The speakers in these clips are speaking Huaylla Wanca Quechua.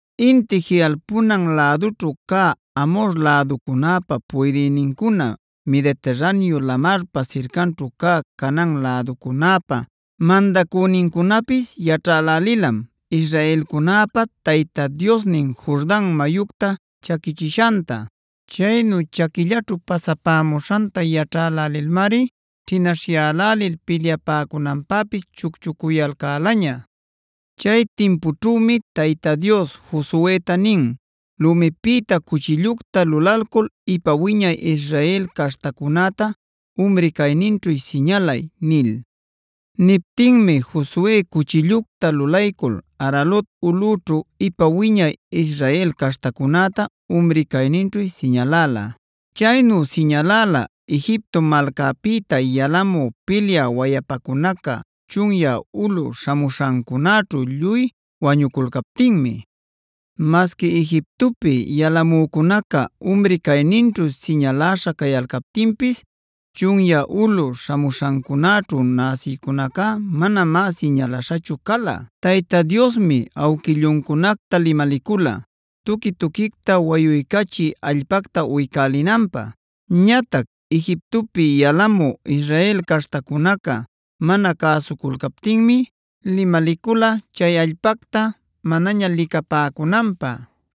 Inti jiꞌalpunan lädućhu cä Amhor läducunäpä puydïnincuna, Mediterraneo lamarpa sircanćhu cä Canaan läducunäpa mandacünincunapis yaćhälälilam israelcunäpa Tayta Diosnin Jordan mayucta chaquichishanta. Chaynu chaquillaćhu pasapämuśhanta yaćhälälilmari ćhinaśhyälälil pilyapäcunanpäpis chucchucuyalcälaña. Chay timpućhümi Tayta Dios Josueta nin: “Lumipïta cuchillucta lulalcul ipa wiñay Israel caśhtacunäta umri cayninćhu siñalay” nil. Niptinmi Josue cuchillucta lulaycul Aralot ulꞌüćhu ipa wiñay Israel caśhtacunäta umri cayninćhu siñaläla. Chaynu siñaläla Egipto malcäpïta yalamü pilyä wayapacunaca chunyä ulꞌu śhamuśhancunäćhu lluy wañuculcaptinmi. Masqui Egiptopi yalamücunaca umri cayninćhu siñaläśha cayalcaptinpis chunyä ulꞌu śhamuśhancunäćhu näsïcunacá manamá siñalaśhachu cala. Tayta Diosmi awquilluncunacta limalicula tuqui-tuquicta wayuycachï allpacta uycälinanpä. Ñatac Egiptopi yalamü Israel caśhtacunaca mana cäsuculcaptinmi limalicula chay allpacta manaña licapäcunanpä.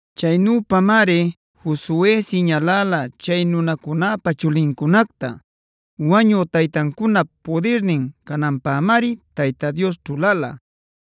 Chaynüpamari Josue siñaläla chay nunacunäpä chulincunacta. Wañü taytancunap pudirnin cananpämari Tayta Dios ćhulala.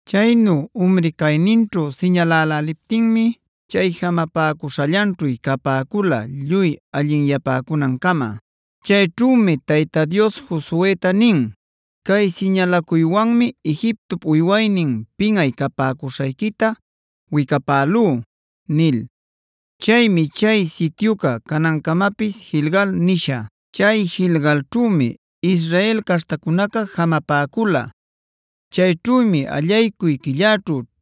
Chaynu umri cayninćhu siñaläläliptinmi chay jamapäcuśhallanćhu capäcula lluy allinyapäcunancama. Chayćhümi Tayta Dios Josueta nin: “Cay siñalacuywanmi Egiptop uywaynin pinꞌay capäcuśhayquita wicapälú” nil. Chaymi chay sityuca canancamapis Gilgalc nisha. Chay Gilgalćhümi Israel caśhtacunaca jamapäcula. Chayćhümi allaycuy quillaćhu,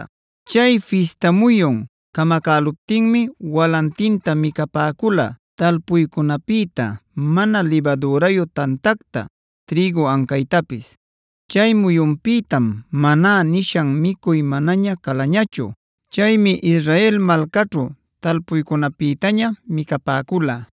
Chay fista muyun camacäluptinmi walantinta micapäcula talpuycunapïta: mana libadürayu tantacta, trïgu ancaytapis. Chay muyunpïtam “Maná”e nishan micuy manaña calañachu. Chaymi Israel malcaćhu talpuycunapïtaña micapäcula.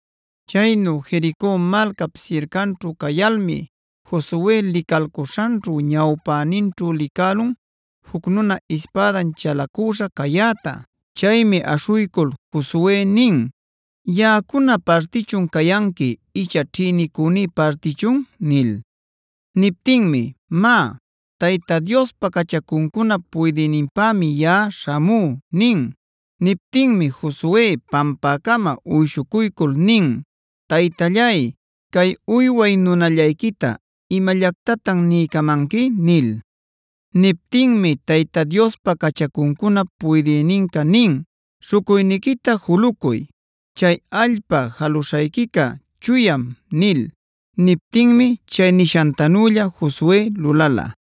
Chaynu Jerico malcap sircanćhu cayalmi Josue licalcuśhanćhu ñawpäninćhu licälun juc nuna ispädan chalacüśha cayäta. Chaymi aśhuycul Josue nin: “¿Yaꞌacuna partichun cayanqui icha ćhïnicüní partichun?” nil. Niptinmi: “Má, Tayta Diospa cachacuncunap puydïninpämi yaꞌa śhamú” nin. Niptinmi Josue pampäcama uyshucuycul nin: “Taytallay, ¿cay uyway nunallayquita imallactatan niycamanqui?” nil. Niptinmi Tayta Diospa cachacuncunap puydïninca nin: “Śhucuyniquita julucuy. Chay allpa jaluśhayquica chuyam” nil. Niptinmi chay nishantanülla Josue lulala.